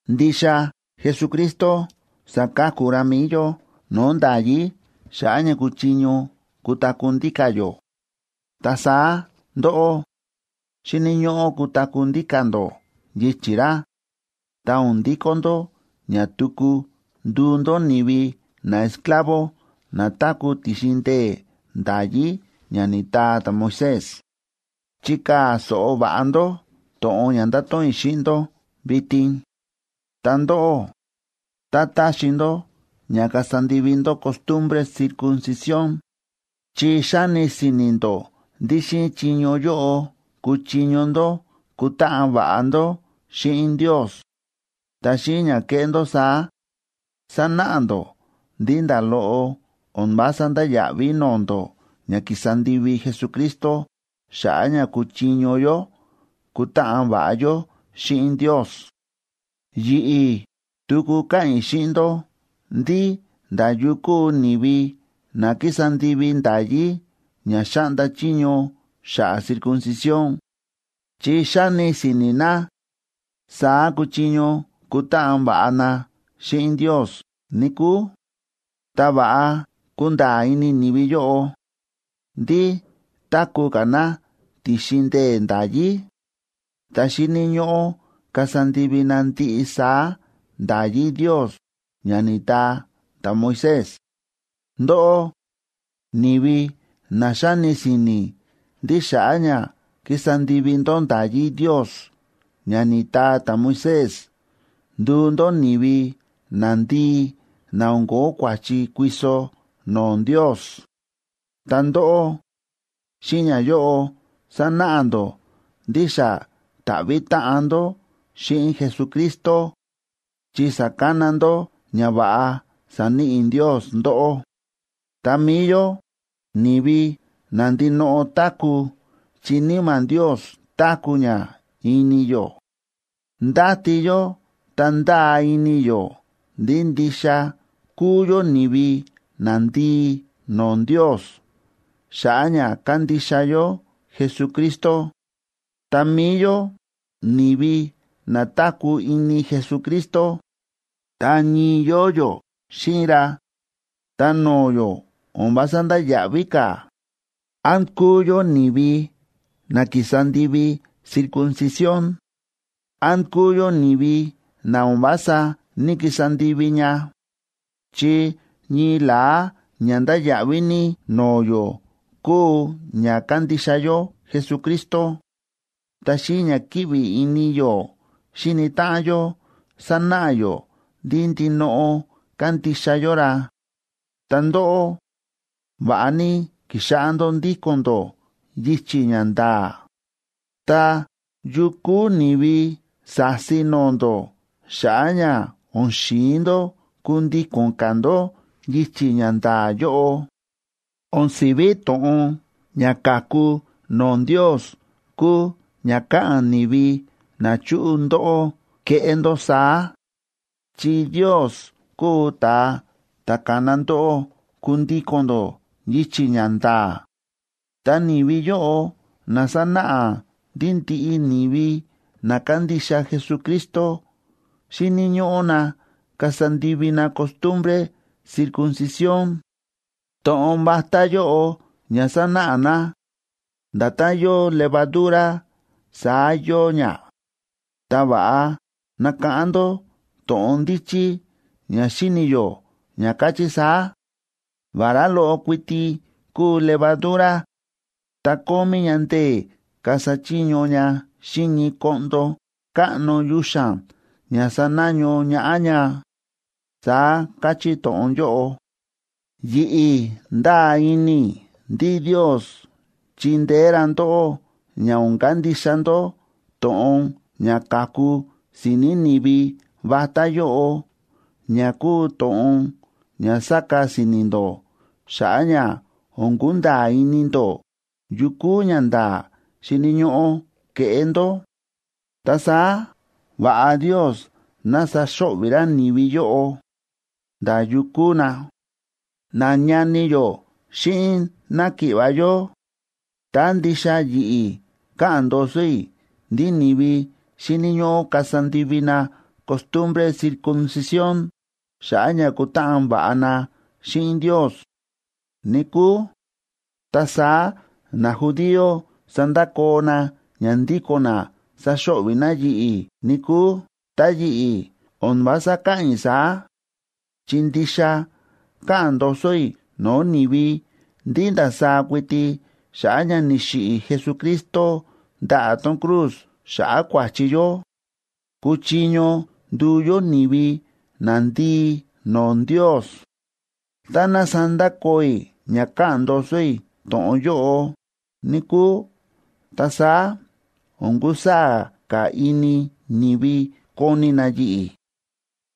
Ndixa Jesucristo sa̱ka̱ku ra mi̱i yó no̱o̱ nda̱yí xa̱ꞌa̱ ña kuchiño kutaku̱ ndíka̱ yó. Ta saá ndóꞌó, xíni̱ ñóꞌó kutaku̱ ndíka̱ ndó yichi̱ ra, ta o̱n ndikó ndó ña tuku nduu ndó ni̱vi naesclavo na táku̱ ti̱xin ndee̱ nda̱yí ña ni̱taa ta̱Moisés. Chikaa̱ so̱ꞌo va̱ꞌa ndó to̱ꞌon ña ndato̱ꞌon i̱ xíꞌin ndó vitin: Ta ndóꞌó, tá taxi ndó ña kasa ndivi ndó costumbre circuncisión, chi xáni si̱ni̱ ndó ndí xíꞌin chiño yóꞌo kuchiño ndó kutáꞌan va̱ꞌa ndó xíꞌin Ndios, ta xíꞌin ña keꞌé ndó saá, sanáꞌa ndó ndí nda̱ loꞌo o̱n vása ndáya̱ꞌví no̱o̱ ndó ña ki̱sa ndivi Jesucristo xa̱ꞌa̱ ña kuchiño yó kutáꞌan va̱ꞌa yó xíꞌin Ndios. Yi̱ꞌi̱, tuku káꞌa̱n i̱ xíꞌin ndó ndí nda̱ yu kúu ni̱vi na kísa ndivi nda̱yí ña xáꞌnda chiño xa̱ꞌa̱ circuncisión, chi xáni si̱ni̱ na saá kuchiño kutáꞌan va̱ꞌa na xíꞌin Ndios, níkúu, ta va̱ꞌa kunda̱a̱ ini ni̱vi yóꞌo ndí táku̱ ka̱ na ti̱xin ndee̱ nda̱yí, ta xíni̱ ñóꞌó kasa ndivi na ndiꞌi saá nda̱yí Ndios ña ni̱taa ta̱Moisés. Ndóꞌó, ni̱vi na xáni si̱ni̱ ndí xa̱ꞌa̱ ña kísa ndivi ndó nda̱yí Ndios ña ni̱taa ta̱Moisés nduu ndó ni̱vi nandii na o̱n ko̱ó kua̱chi kuiso no̱o̱ Ndios, ta ndóꞌó, xíꞌin ñayóꞌo sánáꞌa ndó ndí xa ni̱ta̱ꞌvi̱ táꞌan ndó xíꞌin Jesucristo, chi sa̱kana ndó ñava̱ꞌa sa̱níꞌi Ndios ndóꞌó. Ta mi̱i yó, ni̱vi na ndinoꞌo táku̱ chi Níma̱ Ndios táku̱ ña ini yó, ndáti yó ta ndáa ini yó ndí ndixa kúu yó ni̱vi nandii no̱o̱ Ndios xa̱ꞌa̱ ña kándixa yó Jesucristo. Ta mi̱i yó ni̱vi na táku̱ ini Jesucristo, ta ñii yóo yó xíꞌin ra, ta no̱o̱ yó o̱n vása ndáya̱ꞌví ka̱, án kúu yó ni̱vi na ki̱sa ndivi circuncisión, án kúu yó ni̱vi na o̱n vása ní‑kisa ndivi ña. Chi ñii la̱á ña ndáya̱ꞌví ní no̱o̱ yó kúu ña kándixa yó Jesucristo, ta xíꞌin ña kíꞌvi ini yó xíni táꞌan yó sánáꞌa yó ndí ndinoꞌo kándixa yó ra. Ta ndóꞌó, va̱ꞌa ní ki̱xáꞌá ndó ndíko̱n ndó yichi̱ ña nda̱a̱, ta, ¿yu kúu ni̱vi sa̱si no̱o̱ ndó xa̱ꞌa̱ ña o̱n xi̱in ndó kundíko̱n ka̱ ndó yichi̱ ña nda̱a̱ yóꞌo? O̱n si̱ví to̱ꞌon ña káku no̱o̱ Ndios kúu ña káꞌa̱n ni̱vi na chúꞌu ndóꞌó keꞌé ndó saá. Chi Ndios kúu ta̱a ta̱ ka̱na ndóꞌó kundíko̱n ndó yichi̱ ña nda̱a̱. Ta ni̱vi yóꞌo na sánáꞌa ndí ndiꞌi ni̱vi na kándixa Jesucristo xíni̱ ñóꞌó na kasa ndivi na costumbre circuncisión, to̱ꞌon vatá yóꞌo ña sánáꞌa na, nda̱tán yóo levadura saá yóo ña. Ta va̱ꞌa nakáꞌán ndó to̱ꞌon ndíchí ña xíni̱ yó ña káchí saá: “Vará loꞌo kuiti kúu levadura, ta kómí ña ndee̱ kasa chiño ña xíꞌin ñii koꞌndo káꞌno yuxa̱n ña sanaño ñaꞌá ña”, saá káchí to̱ꞌon yóꞌo. Yi̱ꞌi̱ ndáa ini i̱ ndí Ndios chindeé ra ndóꞌó ña o̱n kandixa ndó to̱ꞌon ña káku si̱ni̱ ni̱vi vatá yóꞌo ña kúu to̱ꞌon ña sáka si̱ni̱ ndó xa̱ꞌa̱ ña o̱n kunda̱a̱ ini ndó yu kúu ñanda̱a̱ xíni̱ ñóꞌó keꞌé ndó. Ta saá va̱ꞌa Ndios ná saxo̱ꞌvi̱ ra ni̱vi yóꞌo, nda̱ yu kúu na. Nañani yó xíꞌin náki̱ꞌva̱ yó, tá ndixa yi̱ꞌi̱ káꞌa̱n ndoso i̱ ndí ni̱vi xíni̱ ñóꞌó kasa ndivi na costumbre circuncisión xa̱ꞌa̱ ña kutáꞌan va̱ꞌa na xíꞌin Ndios, níkúu, ta saá najudío sandakoo na ña ndíko̱n na saxo̱ꞌvi̱ na yi̱ꞌi̱, níkúu. Ta yi̱ꞌi̱ o̱n vása káꞌa̱n i̱ saá, chi ndixa káꞌa̱n ndoso i̱ no̱o̱ ni̱vi ndí ndasaá kuiti xa̱ꞌa̱ ña ni̱xiꞌi̱ Jesucristo ndaꞌa̱ tón cruz xa̱ꞌa̱ kua̱chi yó, kúchiño nduu yó ni̱vi nandii no̱o̱ Ndios. Tá ná sandakoo i̱ ña káꞌa̱n ndoso i̱ to̱ꞌon yóꞌo, níkúu, ta saá o̱n kusaa̱ ka̱ ini ni̱vi koni na yi̱ꞌi̱.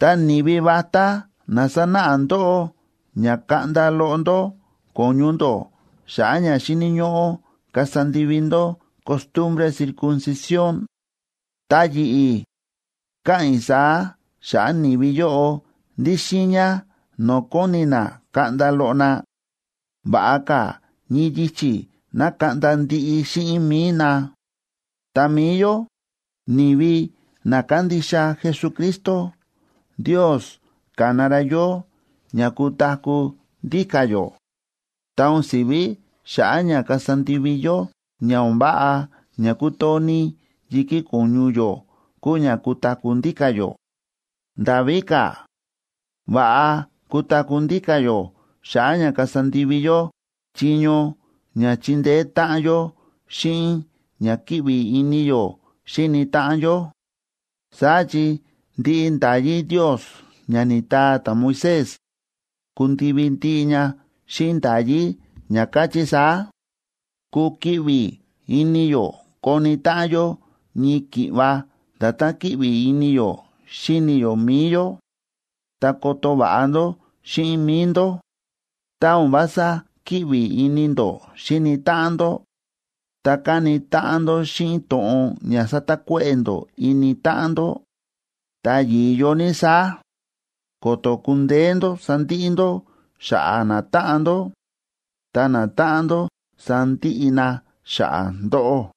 Ta ni̱vi vatá na sánáꞌa ndóꞌó ña kaꞌnda loꞌo ndó ko̱ñu ndó xa̱ꞌa̱ ña xíni̱ ñóꞌó kasa ndivi ndó costumbre circuncisión, ta yi̱ꞌi̱, káꞌa̱n i̱ saá xa̱ꞌa̱ ni̱vi yóꞌo ndí xiiña no̱o̱ kóni na kaꞌnda loꞌo na, ¡va̱ꞌa ka̱ ñii yichi̱ ná kaꞌnda ndiꞌi xíꞌin mi̱i na! Ta mi̱i yó, ni̱vi na kándixa Jesucristo, Ndios ka̱na ra yó ña kutaku̱ ndíka̱ yó. Ta o̱n si̱ví xa̱ꞌa̱ ña kasa ndivi yó ña o̱n váꞌa ña kútoo ní yi̱kí ko̱ñu yó kúu ña kutaku̱ ndíka̱ yó. Nda̱ víka̱, va̱ꞌa kutaku̱ ndíka̱ yó xa̱ꞌa̱ ña kasa ndivi yó chiño ña chindeé táꞌan yó xíꞌin ña kíꞌvi ini yó xíni táꞌan yó. Saá chi ndiꞌi nda̱yí Ndios ña ni̱taa ta̱Moisés, kundivi ndiꞌi ña xíꞌin nda̱yí ña káchí saá: “Kukiꞌvi ini yó koni táꞌan yó ñii ki̱ꞌva nda̱tán kíꞌvi ini yó xíni yó mi̱i yó.” Ta, ¡koto va̱ꞌa ndó xíꞌin mi̱i ndó! Tá o̱n vása kíꞌvi ini ndó xíni táꞌan ndó, ta káni táꞌan ndó xíꞌin to̱ꞌon ña sátakuéꞌe̱ ndó ini táꞌan ndó, ta yi̱yo ní saá, ko̱to̱ kundeé ndó sandiꞌi ndó xa̱ꞌa̱ natáꞌan ndó, ta natáꞌan ndó sandiꞌi na xa̱ꞌa̱ ndóꞌó.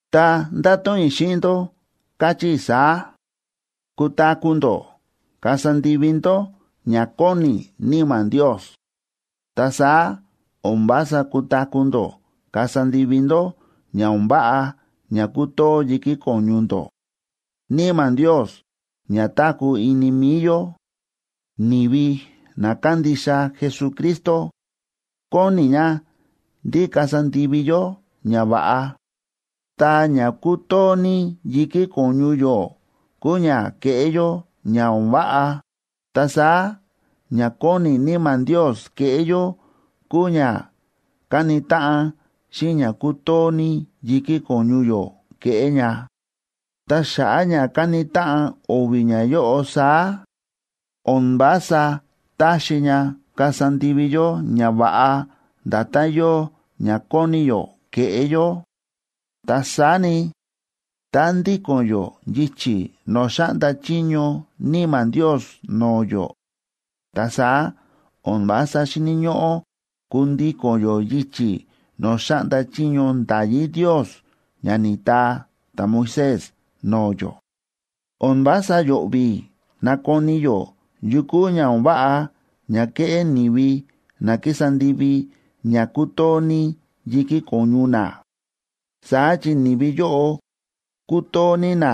Ta ndáto̱ꞌon i̱ xíꞌin ndó, káchí i̱ saá: Kutaku̱ ndó kasa ndivi ndó ña kóni Níma̱ Ndios, ta saá o̱n vása kutaku̱ ndó kasa ndivi ndó ña o̱n váꞌa ña kútoo yi̱kí ko̱ñu ndó. Níma̱ Ndios ña táku̱ ini mi̱i yó, ni̱vi na kándixa Jesucristo, kóni ña ndí kasa ndivi yó ñava̱ꞌa. Ta ña kútoo ní yi̱kí ko̱ñu yó kúu ña keꞌé yó ña o̱n váꞌa. Ta saá ña kóni Níma̱ Ndios keꞌé yó kúu ña káni táꞌan xíꞌin ña kútoo ní yi̱kí ko̱ñu yó keꞌé ña. Ta xa̱ꞌa̱ ña káni táꞌan o̱vi̱ ñayóꞌo saá, o̱n vása táxi ña kasa ndivi yó ñava̱ꞌa nda̱tán yóo ña kóni yó keꞌé yó. Ta saá ni, tá ndíko̱n yó yichi̱ no̱o̱ xáꞌnda chiño Níma̱ Ndios no̱o̱ yó, ta saá o̱n vása xíni̱ ñóꞌó kundíko̱n yó yichi̱ no̱o̱ xáꞌnda chiño nda̱yí Ndios ña ni̱taa ta̱Moisés no̱o̱ yó. O̱n vása yo̱ꞌvi̱ nakoni yó yu kúu ña o̱n váꞌa ña kéꞌé ni̱vi na kísa ndivi ña kútoo ní yi̱kí ko̱ñu na. Saá chi ni̱vi yóꞌo kútoo ní na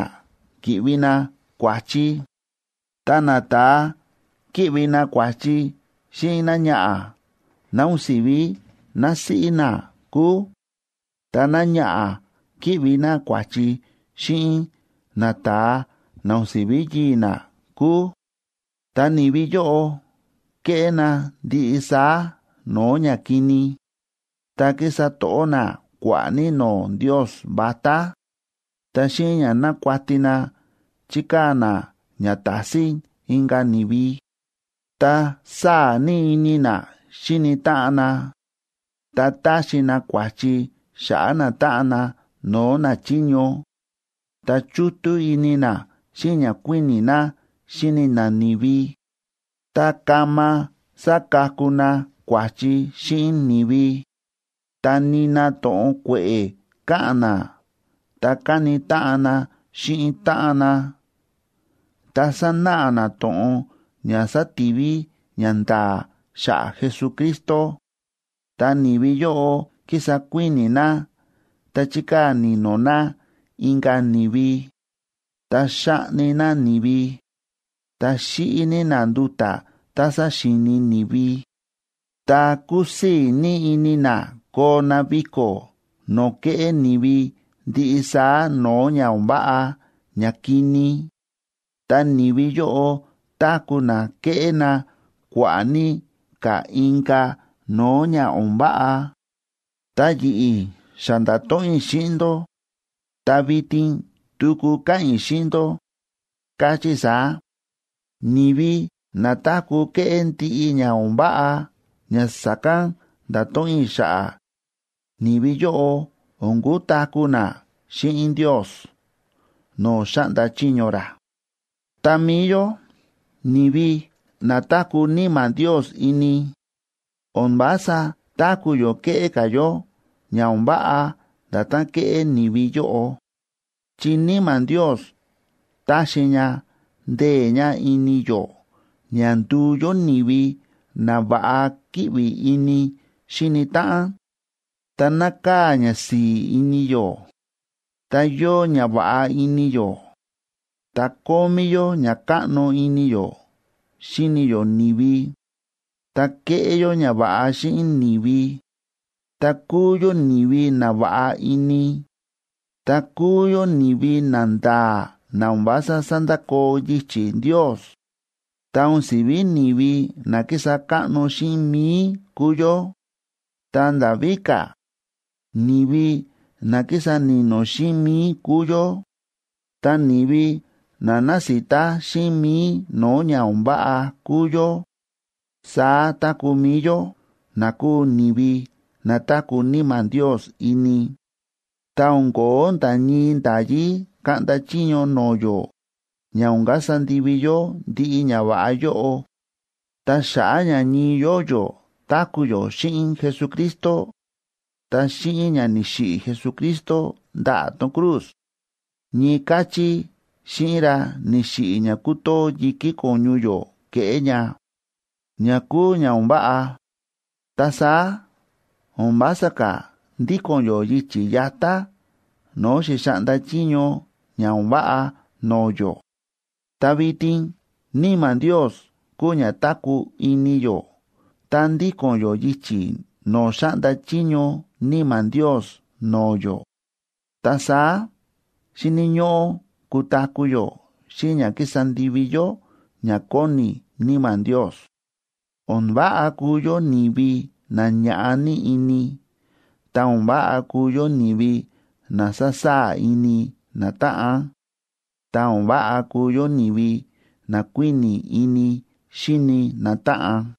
ki̱ꞌvi na kua̱chi, ta nata̱a kíꞌvi na kua̱chi xíꞌin náñaꞌa̱ ná o̱n si̱ví násíꞌí na kúu, ta náñaꞌa̱ kíꞌvi ná kua̱chi xíꞌin nata̱a na o̱n siví yii̱ ná kúu, ta̱ ni̱vi yóꞌo kéꞌé na ndiꞌi saá no̱o̱ ñakini, ta kísa to̱ꞌó na kua̱ꞌa̱ ní no̱o̱ ndios vatá, ta xíꞌin ña nákuati na chíkaa̱ na ña tásín inka̱ ni̱vi, ta sáa̱ ní ini na xíni táꞌan na, ta táxi na kua̱chi xa̱ꞌa̱ natáꞌan na no̱o̱ nachiño, ta chútú ini na xíꞌin ña kuíni̱ na xíni na ni̱vi, ta kama sákaku na kua̱chi xíꞌin ni̱vi, ta nina to̱ꞌon kue̱ꞌe̱ káꞌa̱n na ta káni táꞌan na xíꞌin táꞌan na, ta sánáꞌa na to̱ꞌon ña sátiví ñanda̱a̱ xa̱ꞌa̱ Jesucristo. Ta ni̱vi yóꞌo kísa kuíni̱ na ta chíkaa̱ ni̱no̱ na inka̱ ni̱vi, ta xáꞌni na ni̱vi, ta xíꞌi ní na nduta̱ tá saxíini ni̱vi, ta kúsii̱ ní ini na koo na viko̱ no̱o̱ kéꞌé ni̱vi ndiꞌi saá no̱o̱ ña o̱n váꞌa ñakini, ta ni̱vi yóꞌo táku̱ na kéꞌé na kua̱ꞌa̱ ní ka̱ inka̱ no̱o̱ ña o̱n váꞌa. Ta yi̱ꞌi̱, xa nda̱to̱ꞌon i̱ xíꞌin ndó, ta vitin tuku káꞌa̱n i̱ xíꞌin ndó, káchí i̱ saá: Ni̱vi na táku̱ kéꞌé ndiꞌi ña o̱n váꞌa ña sa̱kán nda̱to̱ꞌon i̱ xa̱ꞌa̱, ni̱vi yóꞌo o̱n kutaku̱ na xíꞌin Ndios no̱o̱ xáꞌnda chiño ra. Ta mi̱i yó, ni̱vi na táku̱ Níma̱ Ndios ini, o̱n vása táku̱ yó kéꞌé ka̱ yó ña o̱n váꞌa nda̱tán kéꞌé ni̱vi yóꞌo. Chi Níma̱ Ndios táxi ña ndee̱ ña ini yó ña nduu yó ni̱vi na va̱ꞌa kíꞌvi ini xíni táꞌan, ta nákaa̱ ñasi̱i̱ ini yó, ta yóo ñava̱ꞌa ini yó, ta kómí yó ña káꞌno ini yó xíni yó ni̱vi, ta kéꞌé yó ñava̱ꞌa xíꞌin ni̱vi, ta kúu yó ni̱vi na va̱ꞌa ini, ta kúu yó ni̱vi nanda̱a̱ na o̱n vása sándakoo yichi̱ Ndios. Ta o̱n si̱ví ni̱vi na kísa káꞌno xíꞌin mi̱i kúu yó, ta nda̱ víka̱, ni̱vi na kísa ni̱no̱ xíꞌin mi̱i kúu yó. Ta ni̱vi na násita xíꞌin mi̱i no̱o̱ ña o̱n váꞌa kúu yó. Saá táku̱ mi̱i yó, na kúu ni̱vi na táku̱ Níma̱ Ndios ini, ta o̱n ko̱ó nda̱ ñii nda̱yí kaꞌnda chiño no̱o̱ yó ña o̱n kasa ndivi yó ndiꞌi ñava̱ꞌa yóꞌo. Ta xa̱ꞌa̱ ña ñii yóo yó táku̱ yó xíꞌin Jesucristo, ta xíꞌin ña ni̱xiꞌi̱ Jesucristo ndaꞌa̱ tón cruz, ñii káchí xíꞌin ra ni̱xiꞌi̱ ña kútoo yi̱kí ko̱ñu yó keꞌé ña, ña kúu ña o̱n váꞌa. Ta saá o̱n vása ka̱ ndíko̱n yó yichi̱ yatá no̱o̱ xi̱xaꞌnda chiño ña o̱n váꞌa no̱o̱ yó. Ta vitin Níma̱ Ndios kúu ña táku̱ ini yó ta ndíko̱n yó yichi̱ no̱o̱ xáꞌnda chiño Níma̱ Ndios no̱o̱ yó. Ta saá xíni̱ ñóꞌó kutaku̱ yó xíꞌin ña kísa ndivi yó ña kóni Níma̱ Ndios. O̱n váꞌa kuu yó ni̱vi na ñáꞌa ní ini, ta o̱n váꞌa kuu yó ni̱vi na sasaa̱ ini natáꞌan, ta o̱n váꞌa kuu yó ni̱vi na kuíni̱ ini xíni natáꞌan.